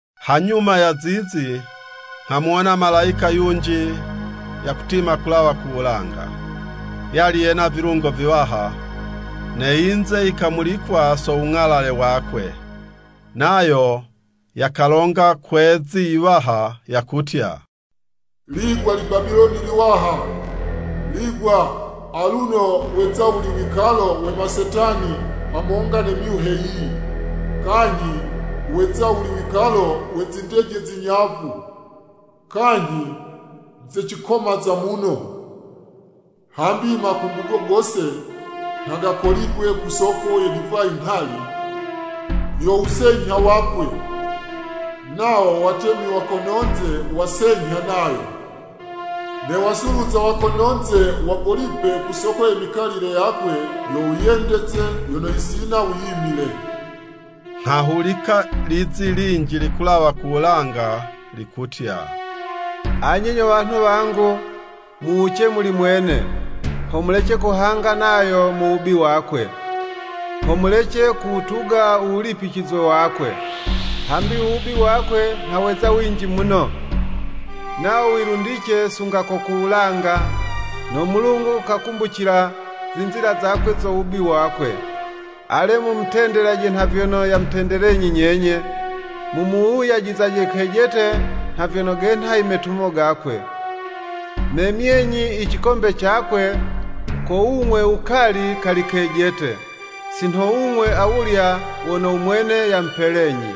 Hanyuma ya zizi, nghamuwona malayika yunji yakutima kulawa ku wulanga. Yali yena vilungo viwaha, ne yinze yikamulikwa so wung'alale wakwe. Nayo yakalonga kwe'zi yiwaha, yakutya, “Ligwa Libabiloni liwaha, lingwa! Aluno weza wuli wikalo we masetani hamonga ne myuhe yiyi, kanyhi weza wuli wikalo we zindeje zinyavu, kanyhi ze cikomaza muno. Hambi i makungugo gose, nha gakoligwe ku soko ye divayi nghali, yo wusenyha wakwe. Nawo watemi wa kono'nze wasenyha nayo, ne wasuluza wa kono'nze wagolipe ku soko ye mikalile yakwe yo wiyendeze, yono yisina wiyimile.” Nghahulika lizi linji likulawa ku wulanga likutya, “Anye nyo wanhu wangu, muwuce muli mwene, ho mulece kuhanga nayo mu wubi wakwe, ho mulece kuwutuga u wulipicizwe wakwe. Hambi u wubi wakwe, nha weza winji muno, nawo wilundice sunga ko ku wulanga, no Mulungu kakumbucila zinzila zakwe zo wubi wakwe. Ale, mumutendelaje nha vyono yamutendelenyi nyenye, mumuwuyajizaje kejete nha vyono genha i metumo gakwe. Memyenyi i cikombe cakwe ko wung'we wukali kali kejete, si nho wung'we awulya wono u mwene yamupelenyi.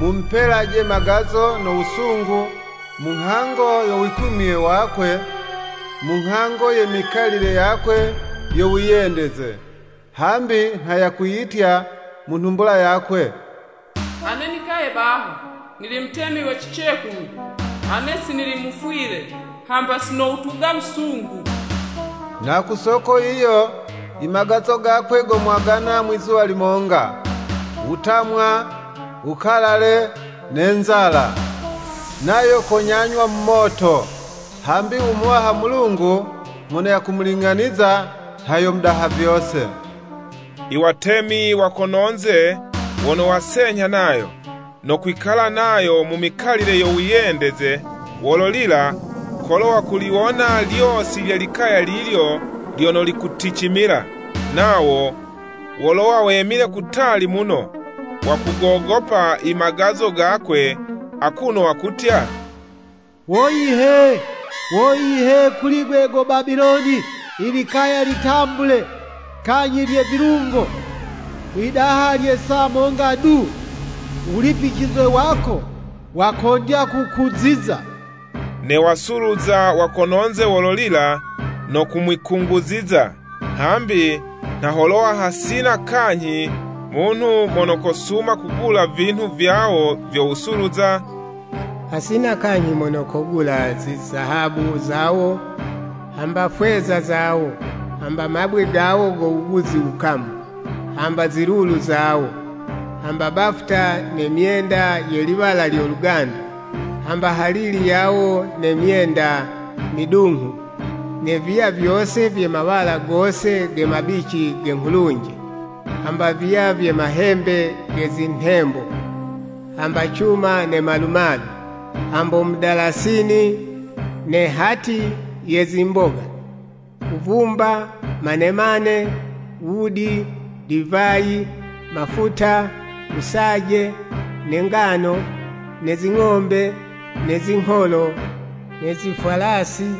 Mumupelaje magazo no wusungu, mu nghango yo wikumye wakwe, mu nghango ye mikalile yakwe yo wiyendeze. Hambi nha yakwiyitya mu nhumbula yakwe, ‘Ane nikaye baha, nili mutemi we cicekulu. Ane si nili mufwile, hamba si nowutuga wusungu!’ Na ku soko yiyo, i magazo gakwe gomwagana mwizuwa limonga, wutamwa, wukalale, ne nzala. Nayo konyanywa mu moto, hambi u Muwaha Mulungu mono yakumuling'aniza, nha yo Mudaha vyose.” I watemi wa kono'nze wono wasenyha nayo, no kwikala nayo mu mikalile yo wiyendeze, wololila, kolo wakuliwona lyosi lye likaya lilyo lyono likuticimila. Nawo wolowa wemile kutali muno, wakugogopa i magazo gakwe, akuno wakutya, “Woyi he! Woyi, he kuli'gwe go Babiloni, i likaya litambule, kanyhi lye vilungo! Mwidaha lya saa monga du, u wulipicizwe wako wakondya kukuziza.” Ne wasuluza wa kono'nze wololila no kumwikunguziza, hambi, nha holowa hasina kanyhi munhu mono kosuma kugula vinhu vyawo vyo wusuluza, hasina kanyhi mono kogula zizahabu zawo, hamba fweza zawo, hamba mabwe gawo go wuguzi wukamu, hamba zilulu zawo, hamba bafuta ne myenda ye liwala lyo lugandu, hamba halili yawo ne myenda midunghu, ne viya vyose vye mawala gose ge mabici ge nghulunje, hamba viya vye mahembe ge zinhembo, hamba cuma ne malumalu, hambo mudalasini, ne hati ye zimboga, wuvumba, manemane, wudi, divayi, mafuta, wusaje, ne ngano, ne zing'ombe, ne zingholo, ne zifwalasi,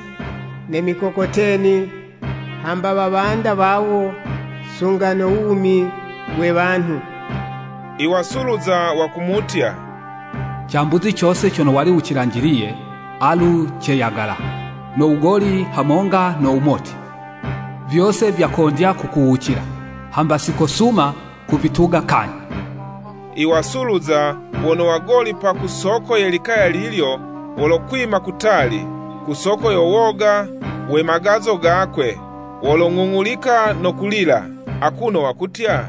ne mikokoteni, hamba wawanda wawo, sunga no wumi we wanhu. I wasuluza wakumutya, “Cambuzi cose cono wali wucilanjiliye, alu ceyagala, no wugoli hamonga no wumoti, vyose vyakondya kukuwucila, hamba si kosuma kuvituga kanyhi!” I wasuluza wono wagolipa ku soko ye likaya lilyo, wolokwima kutali, ku soko yo woga we magazo gakwe, wolong'ung'ulika no kulila, akuno wakutya,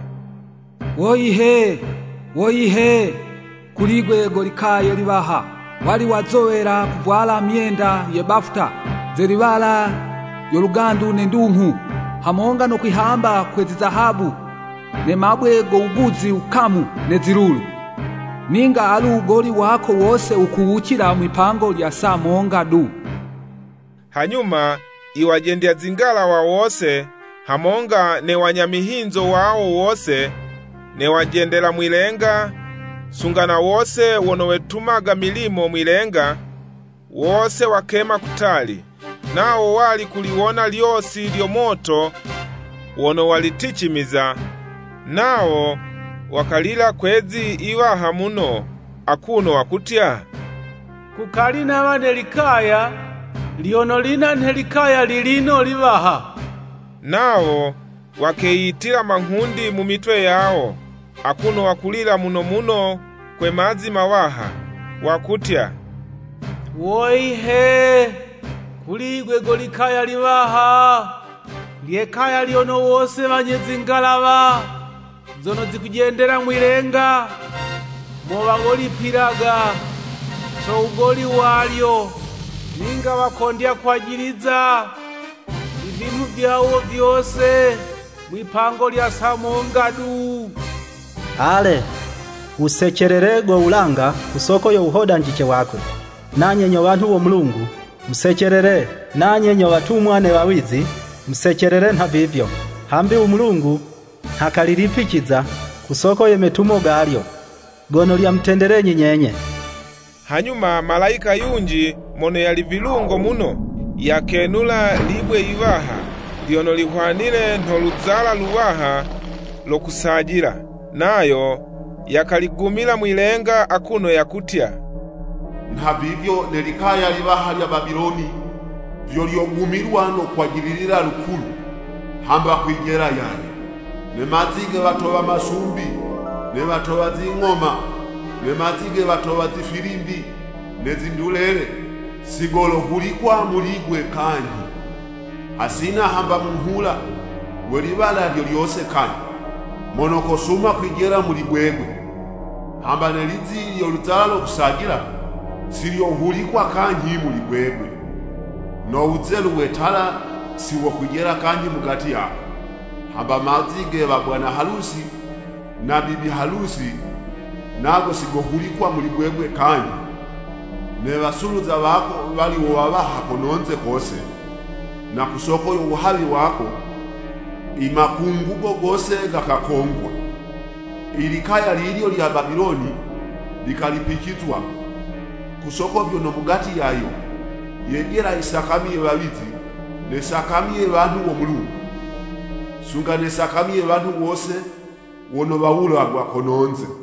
“Woyi he! Woyi he kuli'gwe go likaya liwaha. Wali wazowela kuvwala myenda ye bafuta ze liwala lyo lugandu ne ndunghu, hamonga no kwihamba kwe zizahabu, ne mabwe go wuguzi wukamu ne zilulu!” Ninga alu wugoli wako wose wukuwucila mwi'pango lya saa monga du! Hanyuma i wajendya zingalawa wose, hamonga ne wanya mihinzo wawo wose, ne wajendela mwi'lenga, sunga na wose wono wetumaga milimo mwi'lenga, wose wakema kutali, nawo wali kuliwona lyosi lyo moto wono waliticimiza, nawo wakalila kwe'zi yiwaha muno, akuno wakutya, “Kukali nawa ne likaya lyono linha nhe likaya lilino liwaha!” Nawo wakeyitila manghundi mu mitwe yawo, akuno wakulila muno muno kwe mazi mawaha, wakutya, “Woyi he! Kuli'gwe go 'likaya liwaha! Lye kaya lyono wose wanye zingalawa zono zikujendela mwi'lenga mo wagolipila, so wugoli walyo. Ninga wakondya kwajiliza i vinhu vyawo vyose mwi'pango lya saa monga du!” Ale, wusecelele go wulanga ku soko yo wuhodanjice wakwe. Nanye nyo wanhu wo Mulungu, musecelele, nanye nyo watumwa ne wawizi, musecelele nhavivyo! Hambi u Mulungu nha kalilipiciza ku soko ye metumo galyo, gono lyamutendelenyi nyenye! Hanyuma malayika yunji mono yali vilungo muno, yakenula libwe yiwaha, lyono lihwanile nho luzala luwaha lo kusajila, nayo yakaligumila mwi'lenga akuno yakutya, “Nhavivyo ne likaya liwaha lya Babiloni vyo lyogumilwa no kwajililila lukulu, hamba kwijela yaye. Ne mazi ge watowa masumbi, ne watowa zing'oma, ne mazi ge watowa zifilimbi ne zindulele, si golohulikwa muli'gwe kanyhi. Hasina hamba munghula we liwala lyo lyose kanyhi, mono kosuma kwijela muli gwegwe, hamba ne lizi lyo luzala lo kusajila, si lyohulikwa kanyhi muli gwegwe. No wuzelu we tala si wokwijela kanyhi mugati yako, hamba mazi ge wa bwana halusi na bibi halusi nago si gohulikwa muli gwegwe kanyhi. Ne wasuluza wako wali wo wawaha kononze kose, na ku soko yo wuhawi wako, i makungugo gose gakakongwa.” I likaya lilyo lya Babiloni likalipicizwa, ku soko vyono, mugati yayo, yejela i sakami ye wawizi, ne sakami ye wanhu wo Mulungu, sunga ne sakami ye wanhu wose wono wawulagwa kono'nze.